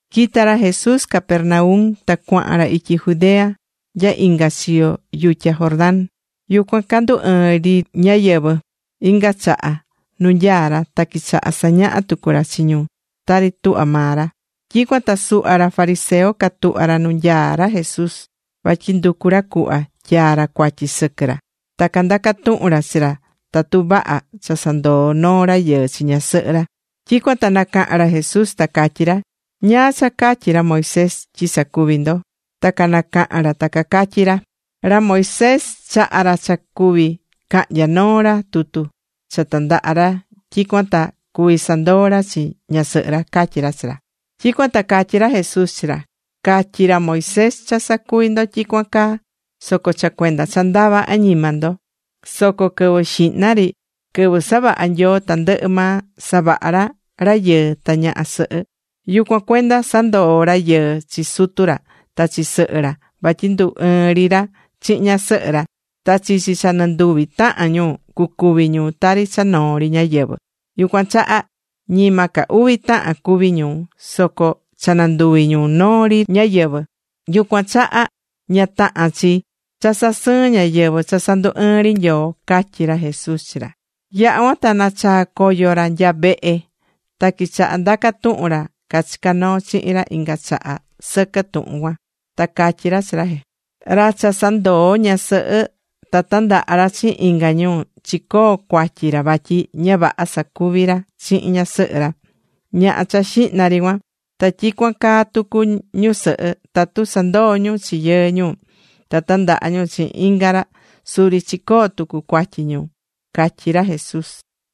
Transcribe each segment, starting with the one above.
Quita̱ ra Jesús Capernaum ta cuahan ra ityi Judea nya inga chiyo yutya Jordán. Yucuan candu̱ ɨɨn ri ñáyɨvɨ inga chaha nu nyaá ra, ta quichaha̱ sañaha tucu ra chi ñu tari tuhvá maa ra. Tyicuan ta suhva ra fariseo catuhva̱ ra nu nyaá ra Jesús, vatyi nducu ra cuhva tyaa ra cuatyi sɨquɨ ra. Ta candaca̱ tuhun ra chi ra tatu vaha cha sandoo noo rayɨɨ chi ñasɨhɨ ra. Tyicuan ta nacaha̱n ra Jesús ta catyí ra: ―¿Ñáá cha catyi̱ ra Moisés tyi sacuví ndo? Ta canacaha̱n ra ta cacatyí ra: ―Ra Moisés chaha̱ ra cha cuví cahnya noo ra tutu cha tandaha ra tyicuan ta cuvi sandoo ra chi ñasɨhɨ ra ―catyí ra chi ra. Tyicuan ta catyí ra Jesús chi ra: ―Catyi̱ ra Moisés cha sacuvi ndo tyicuan caa soco cha cuenda cha ndava añima ndo. Soco quɨvɨ xihna ri, quɨvɨ savaha̱ Nyoo tandɨhɨ maa, savaha̱ ra rayɨɨ ta ñaha sɨhɨ. “Yucuan cuenda sandoó rayɨɨ chi sutu ra ta chi sɨhɨ ra vatyi ndu ɨɨn ri ra chihin ñasɨhɨ ra. Ta chichi cha nɨnduvi tahan ñu cucuvi ñu tari cha noo ri ñáyɨvɨ.” Yucuan chaha ñima ca uvi tahan cuví ñu, soco cha nanduvi̱ ñu noo ri ñáyɨvɨ. Yucuan chaha, ña tahán chi cha sasɨɨn ñáyɨvɨ cha sandu̱ ɨɨn ri Nyoo ―catyí ra Jesús chi ra. Yaha̱ cuan ta nachaa̱ coyo ra nya vehe, ta quichaha̱ ndaca tuhun ra cachicá noo chihin ra inga chaha sɨquɨ tuhun cuan. Ta catyí ra Jesús chi ra: ―Ra cha sandoó ñasɨhɨ ta tandaha ra chihin inga ñu, chicoó cuatyi ra vatyi ña vaha sacuvi̱ ra chihin ñasɨhɨ ra, ñaha cha xihna ri cuan. Ta tyicuan caa tucu ñusɨhɨ. Tatu sandoó ñu chi yɨɨ ñu ta tandaha ñu chihin inga ra suri chicoo̱ tucu cuatyi ñu ―catyí ra Jesús.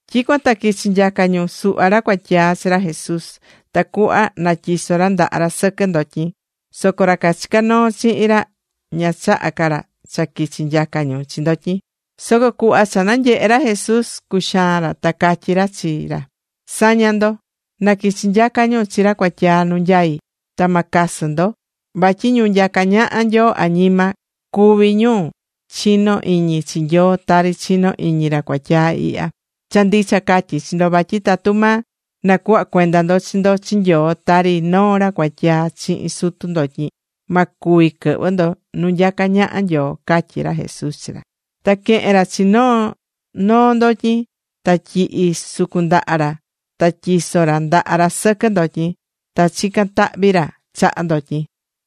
Tyicuan ta quichi̱ nyaca ñu suhva ra cuatyaa chi ra Jesús tacuhva natyiso ra ndaha ra sɨquɨ ndotyin. Soco ra cachicá noo chihin ra ña chahá ca ra cha quichi nyaca ñu chi ndotyin. Soco cuhva cha nanyehe̱ ra Jesús, cuxaan ra. Ta catyí ra chi ra: ―Sa̱ña ndo. Na quichi nyaca ñu chi ra cuatyaa nu nyaí. Ta ma casɨ ndo. Vatyi ñu nyacá ñaha Nyoo añima, cuví ñu chinó iñi chi Nyoo tari chinó iñi ra cuatyaa ihya. Cha ndicha catyí chi ndo vatyi tatu ma nacuhva cuenda ndo chi ndo chi Nyoo tari noo ra cuatyaa chihin sutu ndotyin, ma cuvi quɨhvɨ ndo nu nyacá ñaha Nyoo ―catyí ra Jesús chi ra. Ta quehe̱n ra chi noo noo ndotyin ta tyihi̱ sucun ndaha ra. Ta tyiso̱ ra ndaha ra sɨquɨ ndotyin, ta chica̱n tahvi ra chaha ndotyin.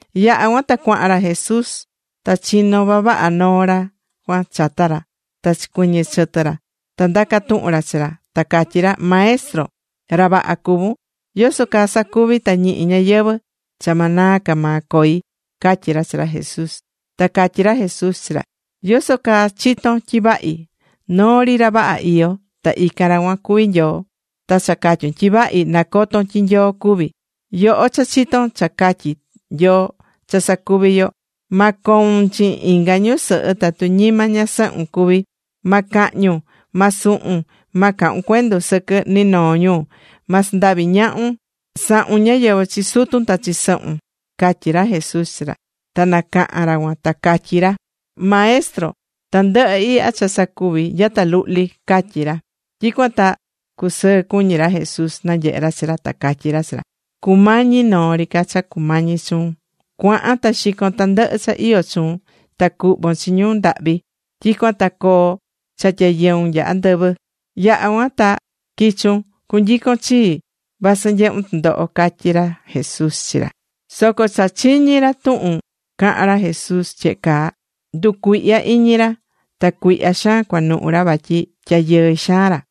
Yaha̱ cuan ta cuahan ra Jesús. Ta chino̱ vavaha noo ra cuan chata ra ta chicuiñi̱ chɨtɨ ra nuu ra, ta ndaca̱ tuhun ra chi ra, ta catyí ra: ―Maestro, ra vaha cuvún. ¿Yoso caa sacuvi ta ñihi ñayɨvɨ̱ cha ma naa ca maa coi? ―catyí ra chi ra Jesús. Ta catyí ra Jesús chi ra: ―¿Yoso caa chitón tyi vahi? Noo ri ra vaha iyó, ta ican ra cuan cuví Nyoo. (Ta cha catyún tyi vahi, nacotón tyi Nyoo cuví.) Yoho cha chitón cha catyí Nyoo cha sacuvi yo: “Ma coun chihin inga ñusɨhɨ tatu ñima ñasɨhun cuví. Ma cahñun. Ma suhun. Ma cahun cuendu sɨquɨ ni noo ñu. Ma sandavi ñahun. Sa̱hun ñáyɨvɨ chi sutun ta chi sɨhun” ―catyí ra Jesús chi ra. Ta nacaha̱n ra cuan ta catyí ra: ―Maestro, tandɨhɨ ihya cha sacuví nyata luhli ―catyí ra. Tyicuan ta cusɨɨ cuñí ra Jesús nanyehé ra chi ra. Ta catyí ra chi ra: ―Cumañi noo ri ca cha cumañi chuun. Cua̱han ta xi̱con tandɨhɨ cha iyó chuun ta cu̱hvon chi ñu ndahvi. Tyicuan ta coo cha tyayɨun nya andɨvɨ. Yaha cuan ta qui̱chun cunyicon chii vasɨ nyehún tɨndoho ―catyí ra Jesús chi ra. Soco cha chiñi̱ ra tuhun caha̱n ra Jesús tyehe caa, nducuihya̱ iñi ra, ta cuihya xaan cuanuhu ra vatyi tyayɨɨ xaan ra.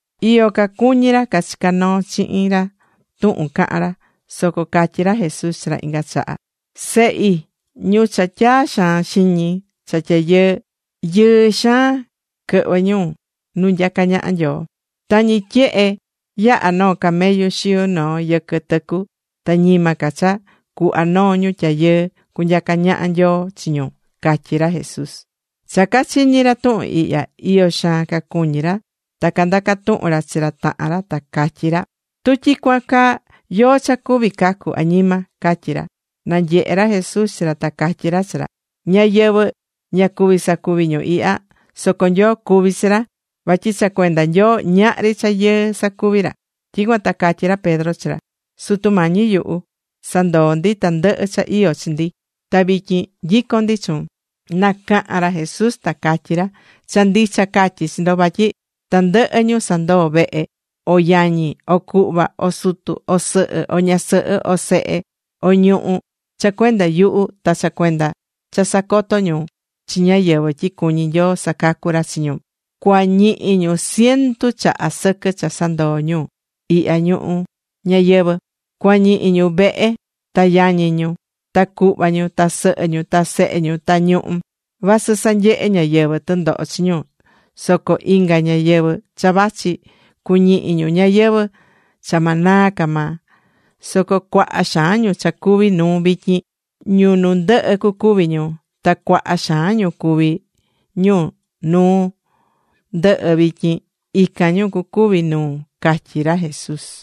Iyo cacuñí ra cachicá noo chihin ra tuhun cahán ra. Soco catyí ra Jesús chi ra inga chaha: ―Sehi, ñu cha tyaa xaan xiñi cha tyayɨɨ, ¡yɨɨ xaan quɨhvɨ ñu nu nyacá ñaha Nyoo! Tañi tyehe yaha noo camellu xiu noo yɨquɨ tɨcu, ta ñima ca cha cuhva noo ñu tyayɨɨ cunyacá ñaha Nyoo chi ñu ―catyí ra Jesús. Cha cachiñi̱ ra tuhun ihya, iyo xaan cacuñí ra, ta candaca̱ tuhun ra chi ra tahan ra, ta catyí ra: ―Tu tyicuan caa, ¿yóó cha cuví cacu añima? ―catyí ra. Nanyehe̱ ra Jesús chi ra ta catyí ra chi ra: ―Ñáyɨvɨ ña cuví sacuvi ñu ihya. Soco Nyoo cuví chi ra. Vatyi cha cuenda Nyoo ñahri cha yɨɨ sacuvi ra. Tyicuan ta catyí ra Pedro chi ra: ―Sutu Mañi yuhu, nyuhu sandoo̱ ndi tandɨhɨ cha iyó chi ndi, ta vityin nyicón ndi chuun. Nacaha̱n ra Jesús ta catyí ra: ―Cha ndicha catyí chi ndo vatyi tandɨhɨ ñu sandoo̱ vehe, o yañi, o cuhva, o sutu, o sɨhɨ, o ñasɨhɨ, o sehe, o ñuhú, cha cuenda yuhu ta cha cuenda cha sacoto ñu chi ñáyɨvɨ tyi cuñí Nyoo sacacu ra chi ñu, cuañihi ñu ciento chaha sɨquɨ cha sandoo̱ ñu ihya ñuhu ñayɨvɨ̱. Cuañihi ñu vehe ta yañi ñu, ta cuhva ñu, ta sɨhɨ ñu, ta sehe ñu, ta ñuhú, vasɨ sanyehe ñáyɨvɨ tɨndoho chi ñu. Soco inga ñayɨvɨ̱ cha vachi, cuñihi ñu ñayɨvɨ̱ cha ma naa ca maa. Soco cuaha xaan ñu cha cuvi nuu vityin, ñu nu ndɨhɨ cucuvi ñu. Ta cuaha xaan ñu cuví ñu nu ndɨhɨ vityin, ican ñu cucuvi nuu ―catyí ra Jesús.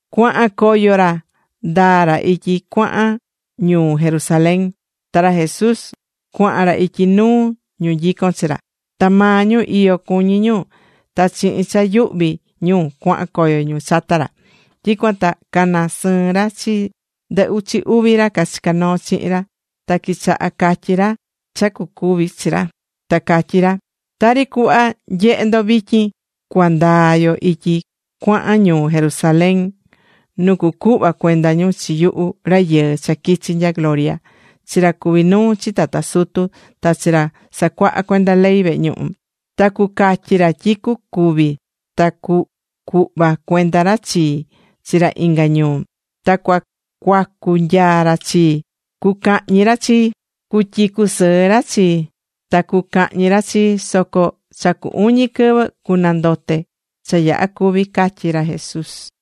Cuahan coyo ra ndaa ra ityi cuahan ñuu Jerusalén, ta ra Jesús cuahan ra ityi nuu ñu nyicón chi ra. Ta maa ñu iyo cuñí ñu ta chihin cha yuhví ñu cuahan coyo ñu chata ra. Tyicuan ta cana sɨɨ̱n ra chi ndɨ uchi uvi ra cachicá noo chihin ra. Ta quichaha̱ catyí ra cha cucuvi chi ra. Ta catyí ra: ―Tari cuhva nyehé ndo vityin, cua ndaa yo ityi cuahan ñuu Jerusalén nu cucuhva cuenda ñu chi yuhu Rayɨɨ cha quichi nya gloria chi ra cuví nuu chi tata sutu, ta chi ra sacuahá cuenda ley vehe ñuhu. Ta cucatyi ra tyi cucúvi ta cucuhva cuenda ra chii chi ra inga ñuu. Ta cucuacu nyaa ra chii, cucañi ra chii, cutyicu sɨɨ ra chii. Ta cucahñi ra chii. Soco cha cu uñi quɨvɨ cunandote cha yaha cúvi ―catyí ra Jesús.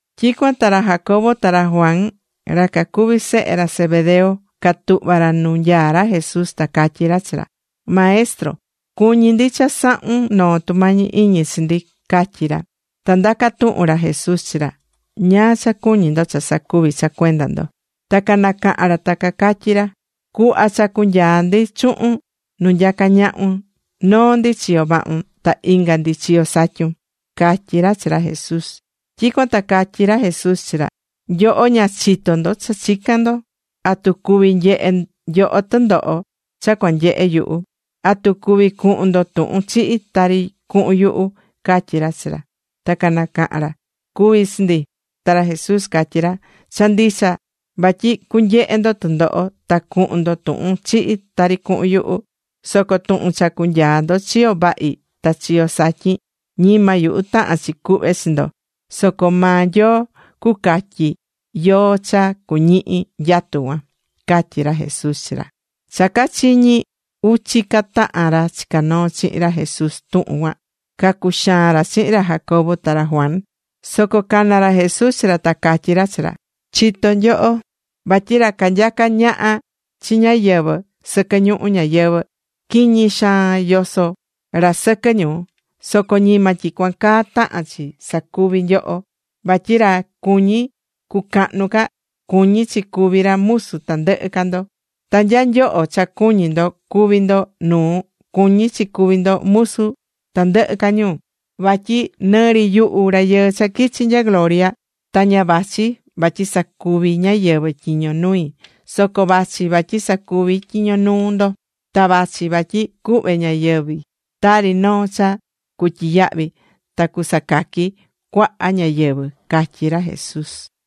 Tyicuan ta ra Jacobo ta ra Juan, ra cacuví sehe ra Zebedeo, catuhva̱ ra nu nyaá ra Jesús, ta catyí ra chi ra: ―Maestro, cuñí ndi cha sa̱hun noo tumañi iñi chi ndi ―catyí ra. Ta ndaca̱ tuhun ra Jesús chi ra: ―¿Ñáá cha cuñí ndo cha sacuvi cha cuenda ndo? Ta canacaha̱n ra ta catyí ra: ―Cu̱hva cha cunyaa ndi chuhun nu nyacá ñahun, noo ndi chiyo vahun, ta inga ndi chiyo satyun ―catyí ra chi ra Jesús. Tyicuan ta catyí ra Jesús chi ra: ―Nyoho ña chitó ndo cha chicán ndo. ¿Atu cuví nyehe nyoho tɨndoho cha cuanyehe yuhu? ¿Atu cuví cuhun ndo tuhun chihi tari cuhun yuhu? ―catyí ra chi ra. Ta canacaha̱n ra: ―Cuví chi ndi. Ta ra Jesús catyí ra: ―Cha ndicha vatyi cunyehe ndo tɨndoho ta cuhun ndo tuhun chihi tari cuhun yuhu. Soco tuhun cha cunyaa ndo chiyo vahi ta chiyo satyin, ñima yuhu tahán chi cuhve chi ndo, soco maa Nyoo cucatyi yóó cha cuñihi nyatu cuan ―catyí ra Jesús chi ra. Cha cachiñi̱ uchi ca tahan ra chicá noo chihin ra Jesús tuhun cuan, cacuxaan ra chihin ra Jacobo ta ra Juan. Soco cana̱ ra Jesús chi ra ta catyí ra chi ra: ―Chitó nyoho vatyi ra canyacá ñaha chi ñáyɨvɨ sɨquɨ ñuhu ñayɨvɨ̱, ñihi xaan yosó ra sɨquɨ ñu. Soco ñima tyicuan caa tahán chi sacuvi nyoho. Vatyi ra cuñí cucahnu ca, cuñí chi cuvi ra musu tandɨhɨ ca ndo. Ta nya nyoho cha cuñí ndo cuví ndo nuu, cuñí chi cuvi ndo musu tandɨhɨ ca ñu. Vatyi nɨ ri yuhu Rayɨɨ cha quichi̱ nya gloria ta ña vachi vatyi sacuvi ñáyɨvɨ tyiño nui. Soco vachi vatyi sacuvi tyiño nuu ndo. Ta vachi vatyi cuhve ñayɨvi̱ tari noo cha cutyiyahvi ta cusacaqui cuaha ñáyɨvɨ ―catyí ra Jesús.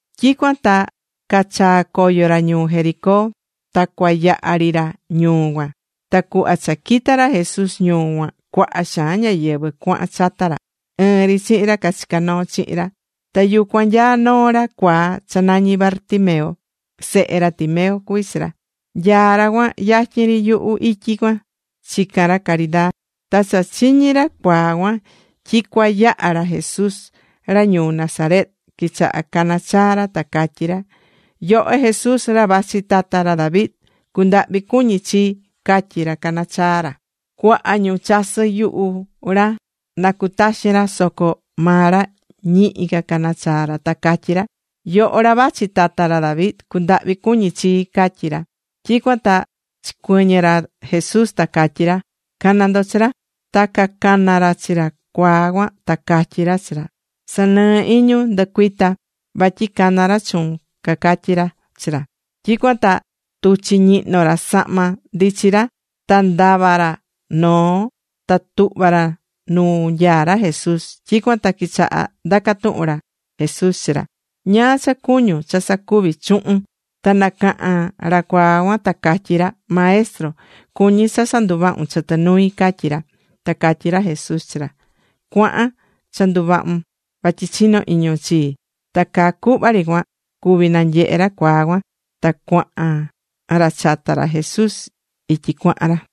Tyicuan ta cachaa̱ coyo ra ñuu Jericó. Ta cua yaha ri ra ñuu cuan. Ta cuhva cha quita̱ ra Jesús ñuu cuan cuaha xaan ñáyɨvɨ cuahan chata ra, ɨɨn ri chihin ra cachicá noo chihin ra. Ta yucuan nyaá noo ra cuaa cha nañí Bartimeo. Sehe ra Timeo cuví chi ra. Nyaá ra cuan yatyin ri yuhu ityi cuan, chicán ra caridaa. Ta cha chiñi̱ ra cuaa cuan tyi cua yaha ra Jesús ra ñuu Nazaret, quichaha̱ cana chaa ra, ta catyí ra: ―¡Yoho Jesús, ra vachi tata ra David, cu̱ndahvi cuñi chii! ―catyí ra canachaá ra. Cuaha ñu chasɨ yuhu ra na cutaxin ra, soco maa ra ñihi ca cana chaa ra ta catyí ra: ―¡Yoho ra vachi tata ra David, cu̱ndahvi cuñi chii! ―catyí ra. Tyicuan ta chicuɨñɨ̱ ra Jesús ta catyí ra: ―Ca̱na ndo chi ra. Ta cacana̱ ra chi ra cuaa cuan ta catyí ra chi ra: ―Sa̱nɨɨ iñun. Ndu̱cuita, vatyi caná ra chuun ―cacatyí ra chi ra. Tyicuan ta tuchi̱ ñihno ra sahma ndichi ra. Ta ndava̱ ra noo ta tuhva̱ ra nuu nyaá ra Jesús. Tyicuan ta quichaha̱ ndaca̱ tuhun ra Jesús chi ra: ―¿Ñáá cha cuñún cha sacuvi chuhun? Ta nacaha̱n ra cuaa cuan ta catyí ra: ―Maestro, cuñí cha sanduvahun chɨtɨ nui ―catyí ra. Ta catyí ra Jesús chi ra: ―Cua̱han. Cha nduvahun vatyi chinó iñun chii. Ta caa cuhva ri cuan cuví nanyehe ra cuaa cuan. Ta cuahan ra chata ra Jesús ityi cuahan ra.